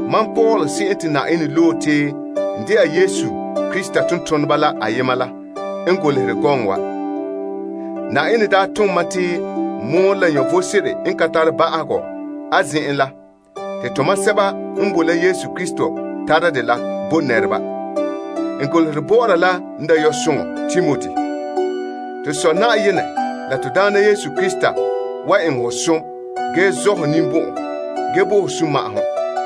Mam Paul se'em te Yenɛ loe te n dɛna Krista Yesu tontoneba la ayema la n golehɛ gɔŋɔ wa. Yenɛ daa tom mam te n mɔɔlɛ la vom sebo n ka tare ba'ahegɔ a zen'en la te tomam sɛba n bo la Krista Yesu tara de bo nɛreba. N golehɛ bɔ'ɔra la n dayɔsoŋa Timoti. To Sɔ Yenɛ la to Daana Yesu Krista wan eŋɛ hɔ som ge zɔ' hɔ ninbɔn'ɔn, ge bo ho sunma'ahom.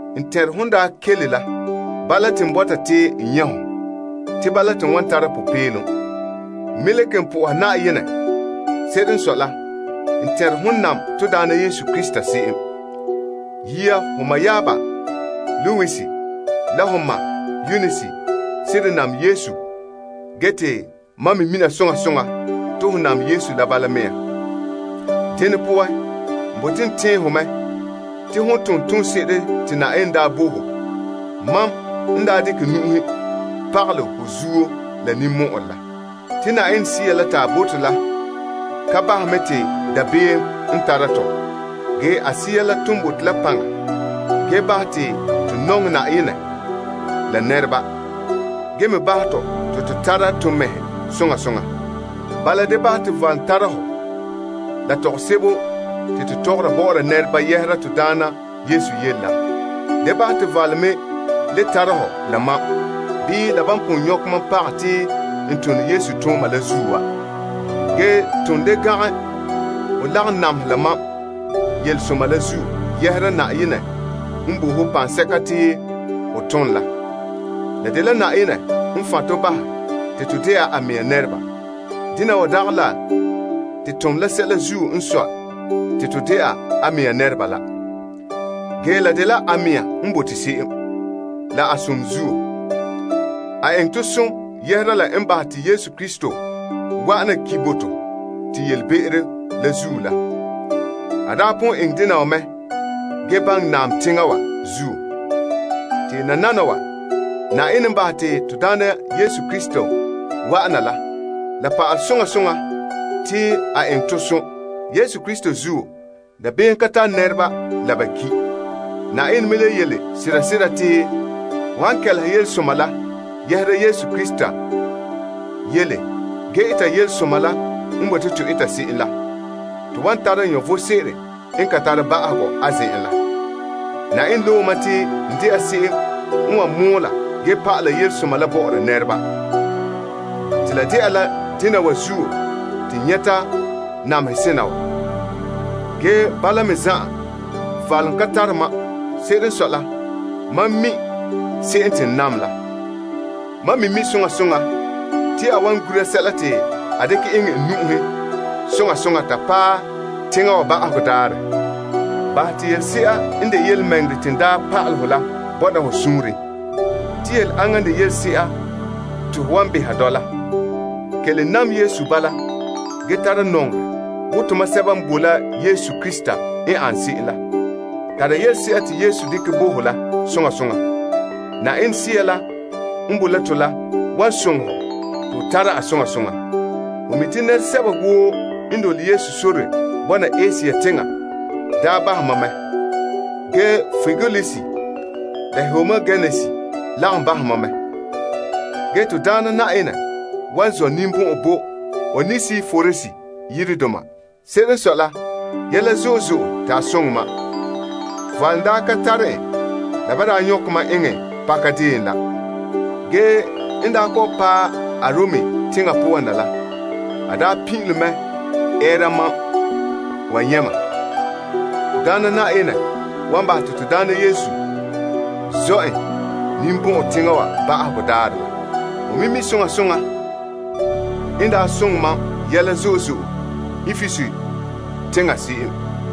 N tɛnre hon daa kele la. Bala, te n bɔta te n nyɛ' hɔ, te bala te n wan tara popeelom. N me le kelom po'ohɛ Yenɛ. Se'ere n sɔe la, n tɛnre hon nam en se'em. Yia ho mayaaba Lois la ho ma' Eunise seren nam Yesu ge te mam me mina soŋa soŋa te ho nam en la bala mea. Dene poan, n bote n tɛɛn ho mɛ te ho tona toonse'ere te Yenɛ daa bo ho, mam n daa dekɛ nu'uhen pagalɛ ho zuo la ninmɔ'ɔrɛ la. Te Yenɛ Sea la te a bo to la ka bahɛ mɛ te dabeem n tara tɔ. Ge, a Sea la ton bo to la paŋa ge bahɛ te to nɔŋɛ Yenɛ la nɛreba, ge me bahɛ tɔ te to tara to mɛhe soŋa soŋa. Bala, da bahɛ te valom tara hɔ la tɔgɔsebo te to tɔgɔra bɔ'ɔra nɛreba yɛhera to Daana yele la. Da bahɛ te valom me le tara hɔ la mam, bii la ban pon nyɔkɛ mam pagɛ te n tone Yesu tooma la zuo wa. Ge ton da gangɛ ho lagom namehɛ la mam yelesoma la zuo yɛhera Yenɛ n bo ho paŋsɛka te ho tom la. La dela Yenɛ n fan' to bahɛ te to dɛna a mɛŋa nɛreba. Dena wa dagɛ la te tom la sɛla zuo n sɔe te to dɛna a mɛŋa nɛreba la. Ge, la dela a mɛŋa n bote se'em, la a som zuo. A eŋɛ tɔ som yɛhera la n bahɛ te Krista Yesu wa'an na ki' bo to te yelebe'ero la zuo la. A daa pon eŋɛ dena wa mɛ ge baŋɛ naam teŋa wa zuo. Te nananawa, Yenɛ n bahɛ te to Faanra Krista Yesu la, la pa'alɛ soŋa soŋa te a eŋɛ tɔ som. Enŋa zuo dabeem ka tara nɛreba la ba ki'. Yenɛ me le yele sera sera te to han kɛleha yelesoma la yɛhera Krista Yesu yele ge eta yelesoma la n bote to eta se'em la, to wan tara vom sebo n ka tare ba'ahegɔ a zen'en la. Yenɛ loe mam te n dɛna se'em n wan mɔɔla ge pa'ala yelesoma la bɔ'ɔra nɛreba. Te la de'a la dena wa zuo te n nyɛta namehe sena wa. Ge, bala mea zan'an valom ka tare mam. Se'ere n sɔe la, mam mi se'em te n nam la. Mam me mi' soŋa soŋa te a wan gura sɛla te a dekɛ eŋɛ n nu'uhen soŋa soŋa ta paɛ teŋa wa ba'ahegɔ daarɛ la. Bahɛ te yelese'a n de yelemɛŋɛrɛ te n daa pa'alɛ hɔ la bɔna ho suunren. Te yele aŋa n de yelese'a te ho wan beha dɔla. Kelom nam Yesu bala ge tara nɔŋerɛ wo tomam sɛba n boe la Krista Yesu n ane se'em la. Tara yelese'a te Yesu dekɛ bo ho la soŋa soŋa. Yenɛ Sea la n boe la to la wan soŋɛ hɔ te ho tara a soŋa soŋa. Ho mi' te nɛresɛba woo n dole Yesu sore bɔna Asia teŋa daa bahɛ mam mɛ. Ge, Pigelus la Hermogenes lagom bahɛ mam mɛ. Ge Na'ayenɛ wan zɔ' ninbɔn'ɔn bo Onesiporus yiredoma. Se'ere n sɔe la, yɛla zo'e zo'e te a soŋɛ mam. Valom daa ka tare en la ban daa nyɔkɛ mam eŋɛ pakadeen la. Ge n daa kɔ'ɔn paɛ Arom teŋa poan na la, a daa pin'ilom mɛ ɛɛra mam wa nyɛ' mam. Na'ayenɛ wan bahɛ te Na'ayenɛ zɔ a ninbɔn'ɔn teŋa wa ba'ahegɔ daarɛ la. Ho me mi' soŋa soŋa n daa soŋɛ mam yɛla zo'e zo'e Epesus teŋa se'em.